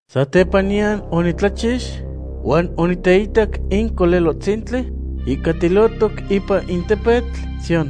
Satepaniyan onitlachix huan oniteitac in Colelohtzintli ihcatilotoc ipan in tepetl Sión.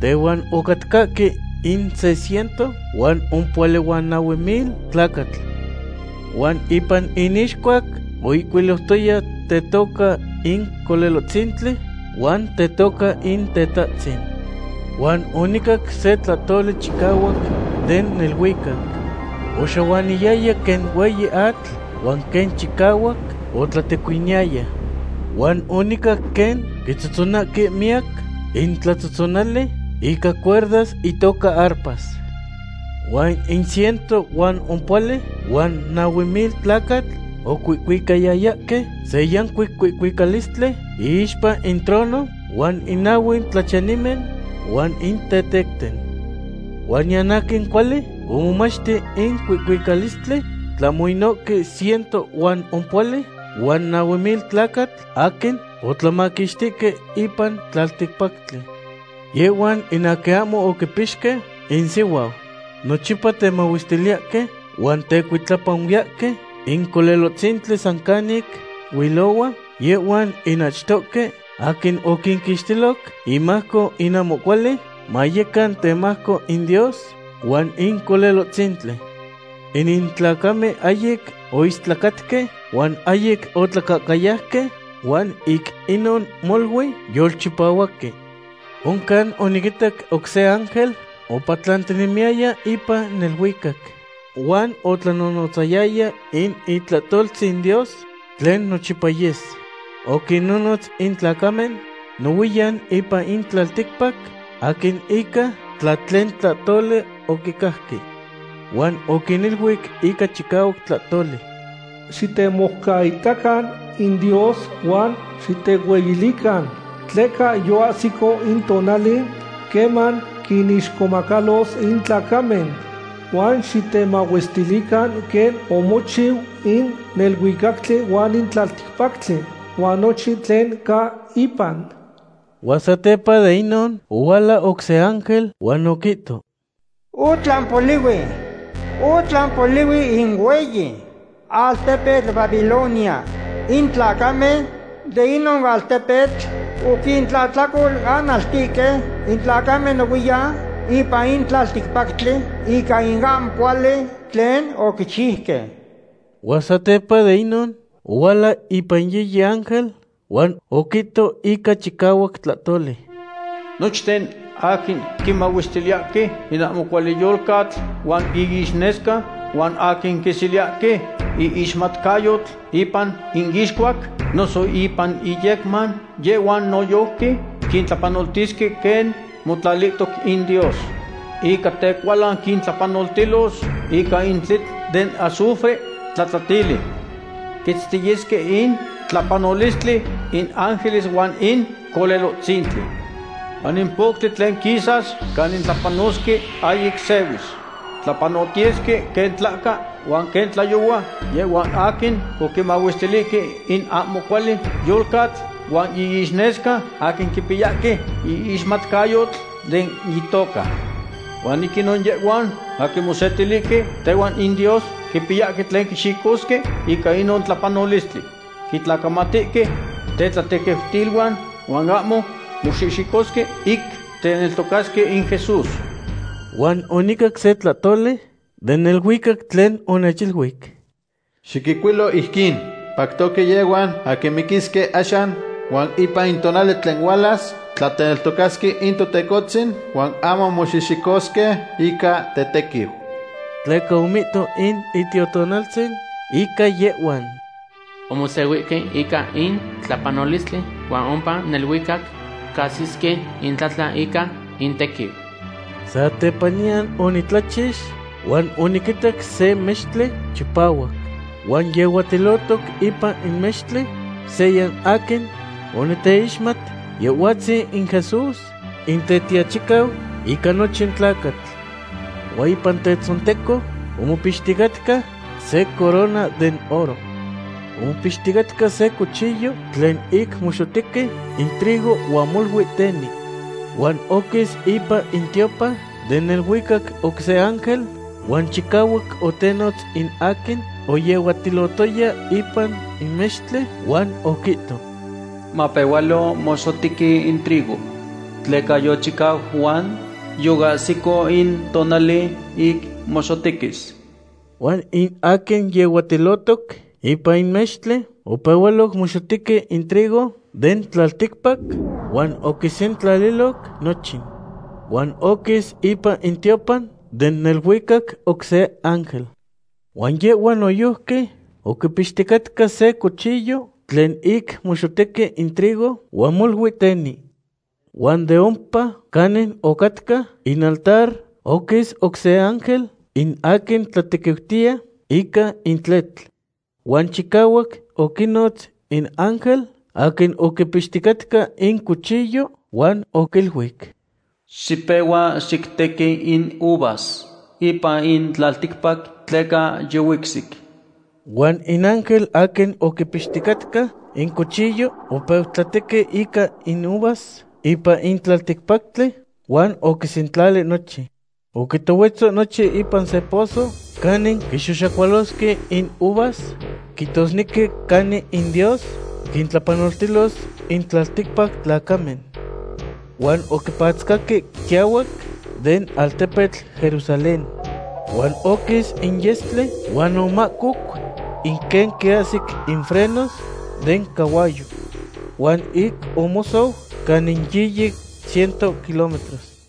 Tehuan ocatcahque in se ciento huan ompohuali huan nahue mil tlacatl. Huan ipan inixcuac oihcuiliutoya tetoca in Colelohtzintli huan tetoca in Tetahtzin. Huan onicac se tlahtoli chicahuac den neluicac. Oxahuaniyaya quen hueyi atl huan quen chicahuac otlatecuiniyaya. Huan onicac quen quitzotzonahque miyac intlatzotzonali ica cuerdas itoca arpas. Huan in ciento huan ompohuali huan nahue mil tlacatl ocuihcuicayayahque se yancuic cuihcuicalistli iixpa in trono huan in nahue tlachiyanimen huan in tetecten. Huan niyan aquin cuali omomachti in cuihcuicalistli tlahmo inohque ciento huan ompohuali huan nahue mil tlacatl aquin otlamaquixtihque ipan tlalticpactli. Yehhuan in aquin ahmo oquipixque insihuau. Nochipa temahuestiliyahque huan tecuitlapanuiyahque in Colelohtzintli san canic huilohua, yehhuan in achtohque aquin oquinquixtiloc imajco in ahmo cuali, mayecan temajco in Dios huan in Colelohtzintli. Inin tlacamen ahyic oistlacatque huan ahyic otlacahcayauque, huan ic inon molui yolchipahuaque. Oncan oniquitac oc se ángel opatlantinemiyaya ipan neluicac. Huan otlanonotzayaya in itlahtoltzin Dios tlen nochipa yes. Oquinnonotz in tlacamen nohuiyan ipan in tlalticpac, aquin ica tlahtlen tlahtoli oquicajque. Huan oquiniluic ica chicahuac tlahtoli: ―Xitemoucaitacan in Dios huan xitehueyilican, tleca yoahsico in tonali queman quinixcomacalos in tlacamen. Huan xitemahuestilican quen omochiu in neluicactli huan in tlalticpactli, huan nochin tlen ca ipan. Huan satepa de inon ohuala oc se ángel huan oquihto: ―¡Otlan polihui! ¡Otlan polihui in hueyi altepetl Babilonia! In tlacamen de inon altepetl oquintlahtlacolanaltihque in tlacamen nohuiyan ipan in tlalticpactli ica in ahmo cuali tlen oquichiuque. Huan satepa de inon ohuala ipan yiyi ángel, huan oquihto ica chicahuac tlahtoli: ―Nochten aquin quinmahuestiliyahque in ahmo cuali yolcatl huan iixnesca, huan aquin quiseliyahque iixmatcayotl ipan iixcuac noso ipan iyecman, yehhuan noyojqui quintlapanoltisque quen motlalihtoc in Dios. Ica tecualan quintlapanoltilos ica in tletl den azufre tlatlatili. Quitztiyesque in tlapanolistli in ángeles huan in Colelohtzintli. Huan in poctli tlen quisas canin tlapanosque ahyic sehuis. Tlapanotiyesque quen tlahca huan quen tlayohua yehhuan aquin oquinmahuestilihque in ahmo cuali yolcatl huan iixnesca, aquin quipiyahque iixmatcayotl den itoca. Huan ic inon yehhuan aquin mosetilihque tehuan in Dios quipiyahque tlen quixicosque ica inon tlapanolistli. Quitlacamatihque tetlatequiutiluan huan ahmo moxihxicosque ic teneltocasque in Jesús. Huan onicac se tlahtoli den neluicac tlen onechiluic: ―Xiquihcuilo ijquin: “Pactoque yehhuan aquin miquisque axan huan ipan in tonali tlen hualas, tla teneltocasque in Totecohtzin huan ahmo moxihxicosque ica tetequiu.” Tleca omihto in Itiotonaltzin ica yehhuan: “Omosehuihque ica in tlapanolistli huan ompa neluicac cahsisque itlatlan ica intequiu.” Satepaniyan onitlachix huan oniquitac se mextli chipahuac. Huan yehuatilotoc ipan in mextli seya aquin oniteixmat, Yehhuatzin in Jesús, in Tetiachicau ica nochin tlacatl. Huan ipan tetzonteco omopixticatca se corona den oro. Omopixticatca se cuchillo tlen ic moxotequi in trigo huan molui teni. Huan oquis ipan in tiopan den neluicac oc se ángel huan chicahuac otenotz in aquin oyehuatilotoya ipan in mextli, huan oquihto: ―Mapehualo moxotequi in trigo, tleca yochicau huan yoahsic in tonali ic moxotequis. Huan in aquin yehuatilotoc ipan in mextli opehualoc moxotequi in trigo den tlalticpac, huan oquisentlaliloc nochin. Huan oquis ipan in tiopan den neluicac oc se ángel. Huan yehhua noyojqui oquipixticatca se cuchillo tlen ic moxotequi in trigo huan molui teni. Huan de ompa canin ocatca in altar oquis oc se ángel, in aquin tlatequiutiya ica in tletl. Huan chicahuac oquinotz in ángel aquin oquipixticatca in cuchillo huan oquiluic: ―Xipehua xictequi in uvas ipan in tlalticpac, tleca yihuicsic. Huan in ángel aquin oquipixticatca in cuchillo opeu tlatequi ica in uvas ipan in tlalticpactli huan oquisentlali nochin. Oquitohuetzo nochin ipan se pozo canin quixoxacualasque in uvas, quihtosnequi canin in Dios quintlapanoltilos in tlalticpac tlacamen. Huan oquipatzcaque quiahuac den altepetl Jerusalén. Huan oquis in yestli huan omahcoc in quen quiahsic in frenos den cahuayo. Huan ic omosou canin yiyi ciento kilometros.